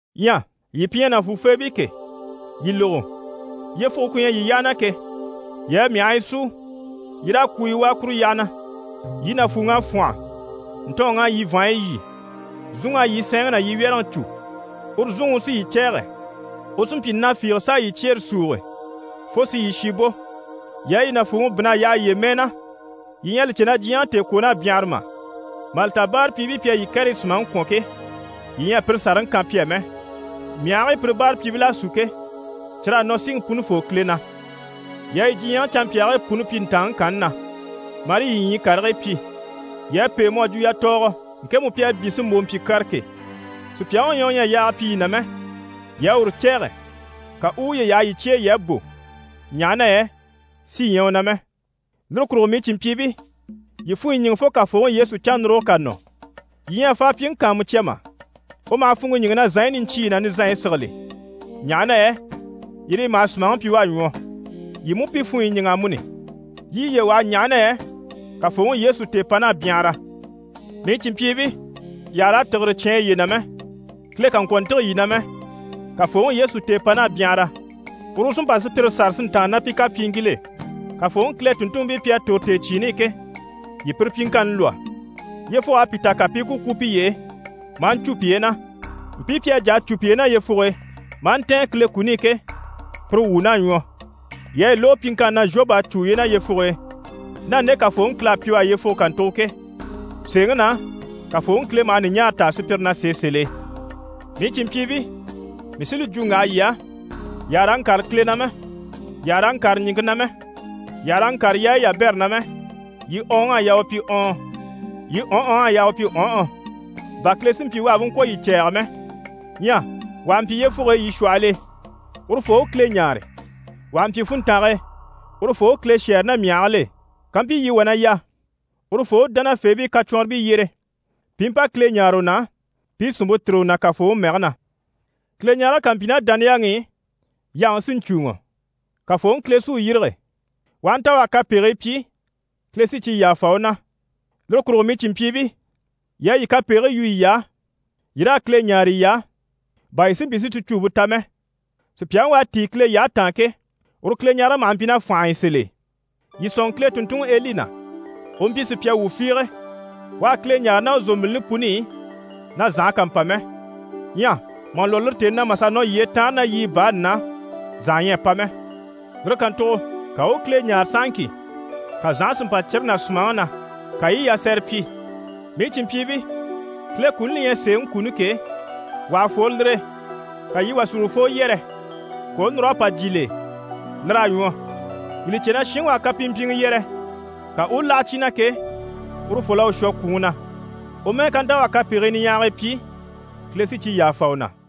Ɲyɛ yii pi ɲyɛ nàfuufeebii ke, yii lógo! Yyefuge ku ɲyɛ yii yyaha na ke, yii a myahii súu, yii raa kwuuyi wàa kuru yyaha na. Yii nàfuuŋ'à fwɔ́nhɔ. Ntɔɔnŋ'à yii vàanɲyi lyî. Zúnŋ'à yii sɛɛnŋi ná yii wyɛ́rɛŋi cû, uru zúnŋi u sí yii cɛ̂ɛgɛ. U sí n‑pyi na fiige s'a yii cyeere súuge fo si yii shi bò. Yii a yii nàfuuŋi bínn'a yaha yiye mɛɛ na, yii ɲyɛ a li cè na diɲyɛŋi tèekwoon'à byanhara mà? Mà li ta báarapyiibii pi à yii kɛrɛyi sùmaŋi kwɔ̀n ke, yii ɲyɛ a pire sàraŋi kan pi á mɛ! Myahigii pire báarapyiibil'à sú ke, cyir'à nɔ Siŋi Punifoo Kile na. Yii à yii diɲyɛŋi canmpyaagii puni pyi ntàanŋi kanni na, marii yii ɲyii karigii pyi. Yii à pêe mu à jwo yatɔɔgɔ, ŋkemu pi à byé si mbò mpyi kyara ke. Sùpyaŋi u ɲyɛ u ɲyɛ a yaaga pyi yii na mɛ, yii à uru cɛ̂ɛgɛ, ka u u uye yaha yii cye e yii à bò, ɲaha na yɛ sí ɲyɛ u na mɛ. Lire kurugo mii cìnmpyiibii, yii funɲyi ɲíŋɛ fo Kafooŋi Yesu cannuruge ká nɔ. Yii ɲyɛ a faapyiŋi kàanmucya mà? U maha funŋke ɲíŋɛ na zànɲyi niɲcyiiyi ná nizanɲyi sigili, ɲaha na yɛ yire yi maha sùmaŋi pyi u à ɲwɔ. Yii mú pi funɲyi ɲíŋɛ amuni, yii i yiye waha, ɲaha na yɛ Kafooŋi Yesu tèepan'à byanhara. Mii cìnmpyiibii, yii àha raa tìgire cyáan yiye na mɛ, Kile kà ŋkwɔ̀ ntîge yii na mɛ. Kafooŋi Yesu tèepan'à byanhara, uru u sí n‑pa sùpyire sâra si ntàanna ná pi kapyiiŋkil'e. Kafooŋi Kile tùnntunmpii pi à tòro tèecyiini i ke, yii pire pyiŋkanni lwɔ́, yyefug'à pi ta, ka pi i ku kwú piye e maa ɲcû piye na. Mpii pi à jà a cû piye na yyefuge e, maa ntɛ̀ɛn Kile kuni i ke, pire wuun'à ɲwɔ. Yii à yi lógo pyiŋkanni na Zhobu à cû uye na yyefuge e, ná nde Kafooŋi Kile à pyi u á yyefuge kàntugo ke. Sèeŋi na, Kafooŋi Kile maha ɲùɲaara taa sùpyire na sèe sèl'e. Mii cìnmpyiibii, mii sí li jwo n‑waha yii á, yii àha raa ŋkâre Kile na mɛ, yii àha raa ŋkâre ɲìŋke na mɛ, yii àha raa ŋkâre yaayi yabɛrɛ na mɛ, yii ɔɔnŋ'à yaa u pyi ɔɔn, yii ɔnhɔŋ'à yaa u pyi ɔnhɔ, bà Kile si mpyi u àha bú ŋkwɔ̀ yii cɛ̂ɛgɛ mɛ. Ɲyɛ wà ha mpyi yyefuge e yii shwɔhɔl'e, urufoo u Kile ɲáare. Wà ha mpyi funntange e, urufoo u Kile shɛ́ɛre ná myahigil'e. Kampyi yii wà na yà, urufoo u dánafeebii kacwɔnribii yyere pi i mpa Kile ɲáare u na, pi i sìnmpe tìri u na Kafooŋi mɛge na. Kileɲarege ká mpyi ná dániyaŋi i, yaŋi sí n‑cùuŋɔ, Kafooŋi Kile sí u yîrige. U aha nta u à kapegii pyi, Kile sí cyi yàfa u na. Lire kurugo mii cìnmpyiibii, yii a yii kapegigii yu yiy'á, yii raa Kile ɲáare yiy'á, bà yii si mpyi si ticuumpe ta mɛ. Sùpyaŋi u à tíi Kile yyahe taan ke, uru Kileɲarege maha mpyi ná fànhe e sèl'e. Yii sɔ̂nŋɔ Kile tùnntunŋi Eli na, u mpyi sùpya wuu fiige. U à Kile ɲáare ná u zòmbilini puni i, na zànha kà mpa mɛ. Ɲyɛ mà lwɔ́ lire tèni na, mà sà nɔ yyee taanre ná yiɲyɛ baani na, zànha ɲyɛ a pa mɛ. Lire kàntugo ka u u Kile ɲáare sahaŋki, ka zànhe si mpa cire ná sùmaŋi na, ka yi i yasɛrɛ pyi. Mii cìnmpyiibii, Kile kuni li ɲyɛ sèeŋi kuni ke, wà ha fworo lire e, ka yii wà si urufoo yɛrɛ, ka u u núr'a pa jyè l'e, lir'à ɲwɔ. Yii li cè na shinŋi u à kapimpyiŋɛ yɛrɛ, ka u u láha cyi na ke, urufol'à u shwɔ kwùŋi na. U mɛ́ɛ ká nta u à kapegii niɲyahagii pyi, Kile sí cyi yàfa u na.